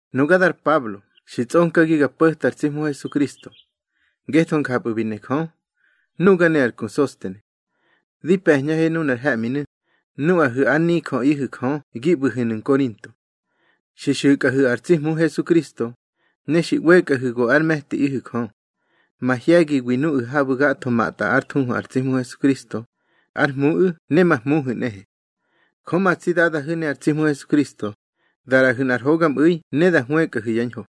Nuga dar Pablo, xi tsꞌonkagi ga po̱ta ar tsi Hmu Hesukristo, ngetho njapꞌu̱ bi ne Jö. Nuga ne ar ku Sostene, di pe̱ñꞌahe nunar he̱ꞌminu̱, nuꞌahu̱ ár nijöꞌihu̱ Jö gi ꞌbu̱hu̱nu̱ Nkorinto. Xi xu̱kꞌahu̱ ar tsi Hmu Hesukristo, ne xi ꞌwekꞌahu̱ go ár me̱tiꞌihu̱ Jö, mahye̱giwi nuꞌu̱ habu̱ gatho matꞌwa ár thuhu ar tsi Hmu Hesukristo, ár Hmuꞌu̱ ne ma Hmuhu̱ nꞌehe. Jö ma tsi Dadahu̱ ne ar tsi Hmu Hesukristo da ꞌraꞌahu̱ nꞌar hogamꞌu̱i ne da hwëkꞌahu̱ yá ñho.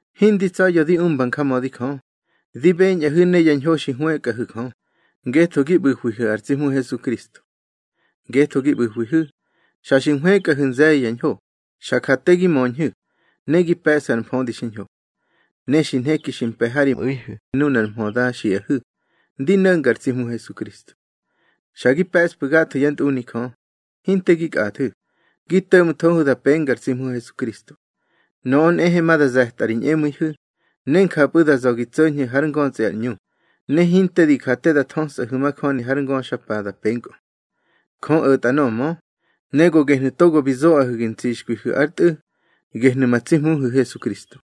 Hindi tsa̱ya̱ di umba njamödi Jö, di beñꞌahu̱ ne ya ñho xi hwëkꞌahu̱ Jö, ngetho gi ꞌbu̱hwihu̱ ar tsi Hmu Hesukristo. Ngetho gi ꞌbu̱hwihu̱, xa xi nhwëkꞌahu̱ nze̱ye̱ ya ñho, xa ja te gi möñhu̱, ne gi pe̱ꞌsu̱ ar mfödi xiñho. Ne xi nheki xi mpe̱ ha ri mꞌu̱ihu̱ nunar mhö da xiꞌahu̱ ndi no̱nga ar tsi Hmu Hesukristo. Xa gi pe̱ꞌsfu̱ gatho yá ntꞌuni Jö, hinte gi kꞌathu̱, gi to̱ꞌmthohu̱ da penga ar tsi Hmu Hesukristo. Nöꞌö nꞌehe ma da ze̱tꞌa ri ñꞌemu̱ihu̱, ne njapꞌu̱ da za̱ gi tso̱ñhu̱ hár ngötsꞌi ar ꞌñu, ne hinte di ja te da thösꞌahu̱ majöni har ngöxapa da penkꞌö. Jö o̱tꞌa nöꞌö mö, ne go gehnu̱ togo bi zoꞌahu̱ gi ntsixkwihu̱ ár Tꞌu̱, gehnu̱ ma tsi Hmuhu̱ Hesukristo.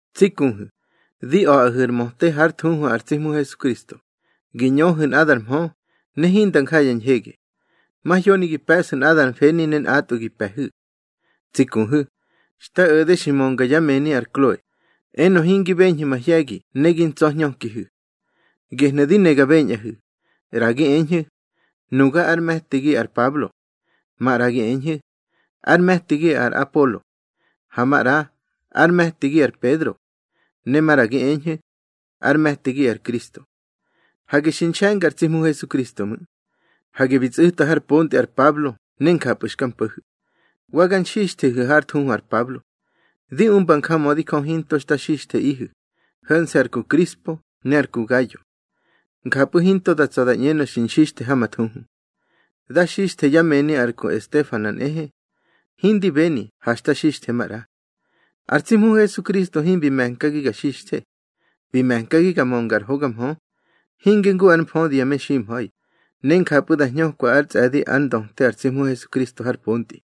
Tsi kuhu̱, di a̱ꞌahu̱ ar möte hár thuhu ar tsi Hmu Hesukristo, gi ñöhu̱ nꞌadar mhö, ne hinda nja ya ñhege. Mahyoni gi pe̱ꞌsu̱ nꞌadar mfeni ne nꞌatꞌwu̱ gi pe̱hu̱. Tsi kuhu̱, xta o̱de xi mönga yá mëni ar Kloe, enö hingi beñhu̱ mahye̱gi ne gi ntsa̱hñökihu̱. Gehnu̱ di ne ga beñꞌahu̱, ꞌra gi eñhu̱: Nuga ár me̱tigi ar Pablo. Maꞌra gi eñhu̱: Ár me̱tigi ar Apolo. Ha maꞌra: Ár me̱tigi ar Pedro. Ne maꞌra gi eñhu̱: Ár me̱tigi ar Kristo. Hage xi nxe̱nga ar tsi Hmu Hesukristo ꞌmu̱. Hage bi tsꞌu̱ta har pontꞌi ar Pablo ne njapꞌu̱ xka mpo̱hu̱. Wa ga nxixthehu̱ hár thuhu ar Pablo. Di umba njamödi Jö hinto xta xixtheꞌihu̱, ho̱nse̱ ar ku Krispo ne ar ku Gayo. Njapꞌu̱ hinto da tsa̱ da ñꞌenö xi nxixthe ha ma thuhu. Da xixthe yá mëni ar ku Estefana nꞌehe. Hindi beni ha xta xixthe maꞌra. Ar tsi Hmu Hesukristo himbi me̱nkagi ga xixthe. Bi me̱nkagi ga mönga ar hoga mhö; hinge ngu ár mfödi ya meximha̱i, ne njapꞌu̱ da hñökwa ár tsꞌe̱di ár ndöte ar tsi Hmu Hesukristo har pontꞌi.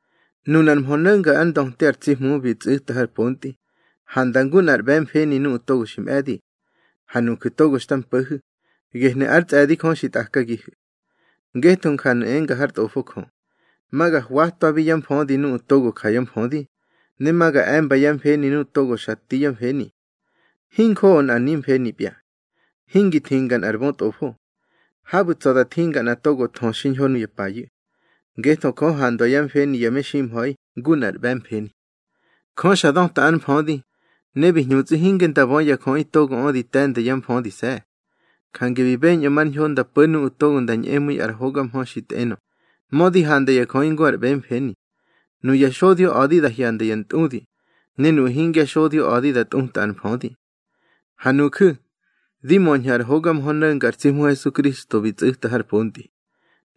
Nunar mhö no̱nga ár ndöte ar tsi Hmu bi tsꞌu̱ta har pontꞌi, handa ngu nꞌar ꞌbe̱mfeni nuꞌu̱ togo xi mꞌe̱di. Ha nuju̱ togo xta mpo̱hu̱, gehnu̱ ár tsꞌe̱di Jö xi tꞌakagihu̱. Ngetho njanu̱ enga hár Tꞌofo Jö: Ma ga hwatwabi yá mfödi nuꞌu̱ togo ja yá mfödi, ne ma ga e̱mba yá mfeni nuꞌu̱ togo xa ti yá mfeni. Hinjoꞌo nꞌar nimfenipya. Hingi thinga nꞌar bötꞌofo. Habu̱ tsa̱ da thinga nꞌa togo thö xiñho nuya payu̱. Ngetho Jö handwa yá mfeni ya meximha̱i ngu nꞌar ꞌbe̱mfeni. Jö xa döta ár mfödi, ne bi hñutsꞌi hinge nda bö ya jöꞌi togoꞌö di te̱nda yá mfödise̱. Jange bi beñꞌö mar ñho nda po̱ nuꞌu̱ nda ñꞌemu̱i ar hoga mhö xi tꞌenö, mödi handa ya jöꞌi ngu ar ꞌbe̱mfeni. Nuya xodyo a̱di da hyanda ya ntꞌudi, ne nuꞌu̱ hingya xodyo a̱di da tꞌuta ar mfödi. Ha nuju̱, di möñhu̱ ar hoga mhö no̱nga ar tsi Hmu Hesukristo bi tsꞌu̱ta har pontꞌi.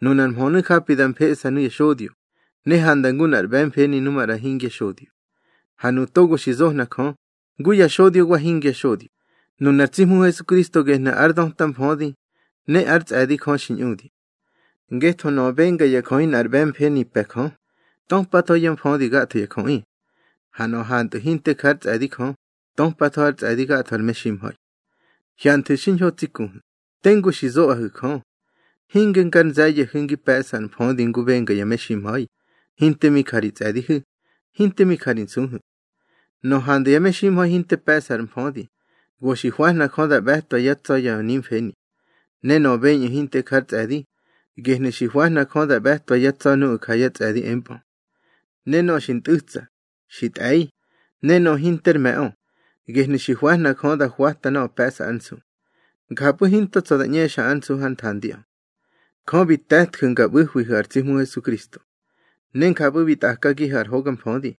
Nunar mhönu̱ japi da mfeꞌsa nuya xodyo, ne handa ngu nꞌar ꞌbe̱mfeni nu maꞌra hingya xodyo. Ha nuꞌu̱ togo xi zohna Jö, ngu ya xodyo wa hingya xodyo, nunar tsi Hmu Hesukristo gehnu̱ ár döta mfödi ne ár tsꞌe̱di Jö xi ñꞌudi. Ngetho nöꞌö benga ya jöꞌi nꞌar ꞌbe̱mfeni pe̱ Jö, töpatho yá mfödi gatho ya jöꞌi. Ha nöꞌö hantꞌu̱ hinte ja ár tsꞌe̱di Jö, töpatho ár tsꞌe̱di gatho ar meximha̱i. Hyanthu̱ xiñho tsi kuhu̱, tengu xi zoꞌahu̱ Jö. Hinge ngar nze̱ye̱hu̱ ngi pe̱ꞌsu̱ ar mfödi ngu benga ya meximha̱i, hinte mi ja ri tsꞌe̱dihu̱, hinte mi ja ri nsuhu̱. Nöꞌö handa ya meximha̱i hinte pe̱ꞌsa ár mfödi, go xi hwahna Jö da ꞌbe̱twa yá tsa̱ ya nimfeni. Ne nöꞌö beñꞌu̱ hinte ja ár tsꞌe̱di, gehnu̱ xi hwahna Jö da ꞌbe̱twa yá tsa̱ nuꞌu̱ ja yá tsꞌe̱di empꞌö. Ne nöꞌö xi ntꞌu̱tsa, xi tꞌe̱i, ne nöꞌö hinter me̱ꞌö, gehnu̱ xi hwahna Jö da hwata nöꞌö pe̱ꞌsa ár nsu. Njapꞌu̱ hinto tsa̱ da ꞌñexa ár nsu hár nthandiꞌö. Jö bi te̱tju̱ nga ꞌbu̱hwihu̱ ar tsi Hmu Hesukristo. Ne njapꞌu̱ bi tꞌakagihu̱ ar hoga mfödi,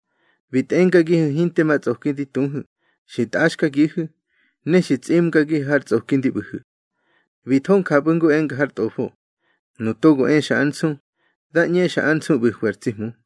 bi tꞌengagihu̱ hinte ma tsꞌoki di tuhu̱, xi ntꞌaxkagihu̱, ne xi tsꞌimgagihu̱ har tsꞌoki ndi ꞌbu̱hu̱. Bi tho njapꞌu̱ ngu enga har Tꞌofo: Nu togo exa ár nsu, dá ꞌñexa ár nsu ꞌbu̱hwi ar tsi Hmu.